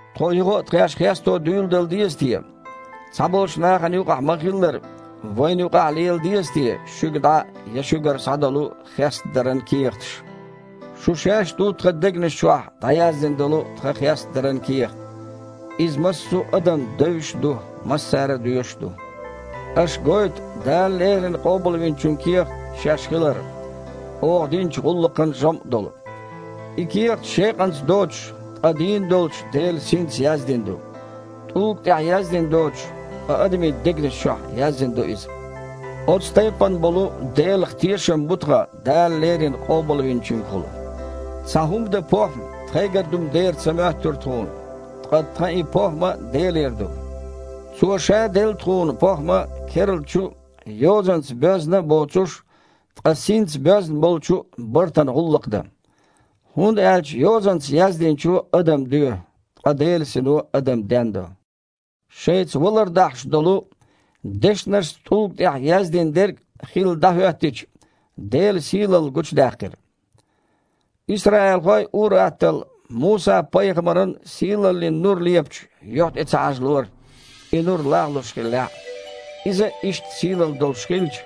Тхо юха а тхаьш хесто дуьйладала деза те? Цхьаболчу нахана юкъахь ма-хиллара, вайна юкъахь а лела деза те шуьга дІа я шуьгара схьа долу хестадаран кехаташ? Шу шаьш ду тхан дегнаш чохь дІаяздина долу тхан хестадаран кехат. Иза массо а адамна девзаш а ду, массара доьшуш а ду. Аша гойту Дала леррина Къобалвинчун кехат шаьш хилар, оха динчу гІуллакхан жамІ долу. И кехат шекъанца доцуш, ткъа дийна долчу Делан Синца яздина ду. ТІулга тІехь яздина доцуш, ткъа адамийн дегнаш чохь яздина ду иза. Оцу тайпана болу Делах тешам бу тхан Дала леррина Къобалвинчуьнгахула. Цхьа хІума дан похІма тхайгара ду-м дера ца моьттура тхуна, ткъа тхан и похІма Делера ду. Цо Ша делла тхуна похІма керлачу а, йозанца боьзна а боцуш, ткъа синца боьзна болчу а бартана гІуллакх дан. ХІунда аьлча йозанца яздинчо адам доь, ткъа Делан Сино адам дендо. Шайца валар дахьаш долу, дешнашца тІулга тІехь яздина дерг хилла дІахІоьттича, Делан сийлалла гучудаьккхира. Исраилхой ур-атталла Муса-пайхамаран сийлаллин нур лепачу юьхь тІе ца хьажалора, и нур лагІлуш хиллехь а. Иза а иштта сийлалла долуш хилча,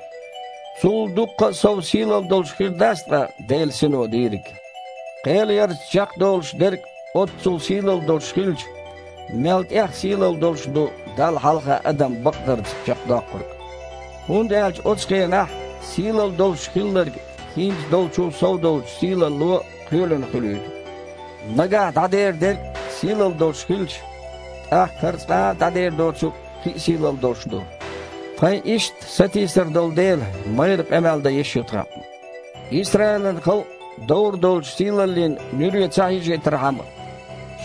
цул дуккха а сов сийлалла долуш хир дац ткъа Делан Сино дийриг?! Кхелъярца чекхдолуш дерг а оццул сийлалла долуш хилча, мел тІех сийлалла долуш ду Далла хьалха адам бакъдарца чекхдоккхург. ХІунда аьлча оцу хенахь сийлалла долуш хилларг хІинца долчул сов долчу сийлалло кхоьлина хуьлуьйту. Нагахь дІадер дерг а сийлалла долуш хилча, тІаккха хІара цкъа а дІадер доцург кхин а сийлалла долуш ду. Тхайн иштта сатийсар долу дела, майрра къамел дан йиш ю тхан. Исраилан халкъ довр долчу сийлаллин нуьре ца хьежийтархьама,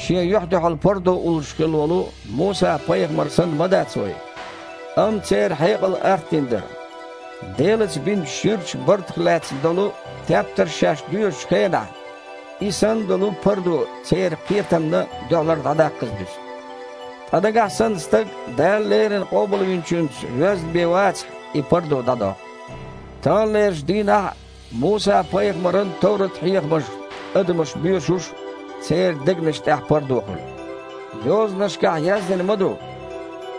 шен юьхь-дуьхьал пардо уллуш хилла волу Муса-пайхамар санна ма дац вай. Амма церан хьекъал артдина дара. Делаца бинчу ширачу бартах лаьцна долу тептарш шаьш доьшучу хенахь, и санна долу пардо церан кхетамна дуьхьалара дІадаккхаза дуьсу. Ткъа нагахь санна стаг Дала леррина Къобалвинчуьнца воьзна бен вацахь, и пардо дІадоккху. Таханлерчу дийнахь а Муса-пайхамаран Товрат-хьехамаш адамаша боьшуш церан дегнаш тІехь пардо хуьлу. Йозанашкахь яздина ма ду: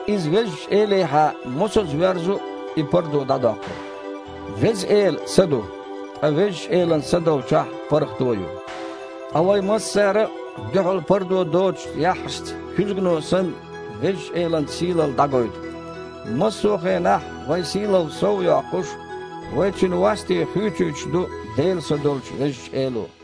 «Иза Везачу Элехьа мосазза воьрзу, и пардо дІадоккхура». Веза Эла – Са ду. Ткъа Везачу Элан Са долчохь – паргІато а ю. Ткъа вай массара а дуьхьал пардо доцучу яххьашца, куьзгано санна, Везачу Элан сийлалла дІагойту. Массо а хенахь вайн сийлалла сов а йоккхуш, вай Цуьнан васте хуьйцуьйтуш ду Делан Са долчу Везачу Эло.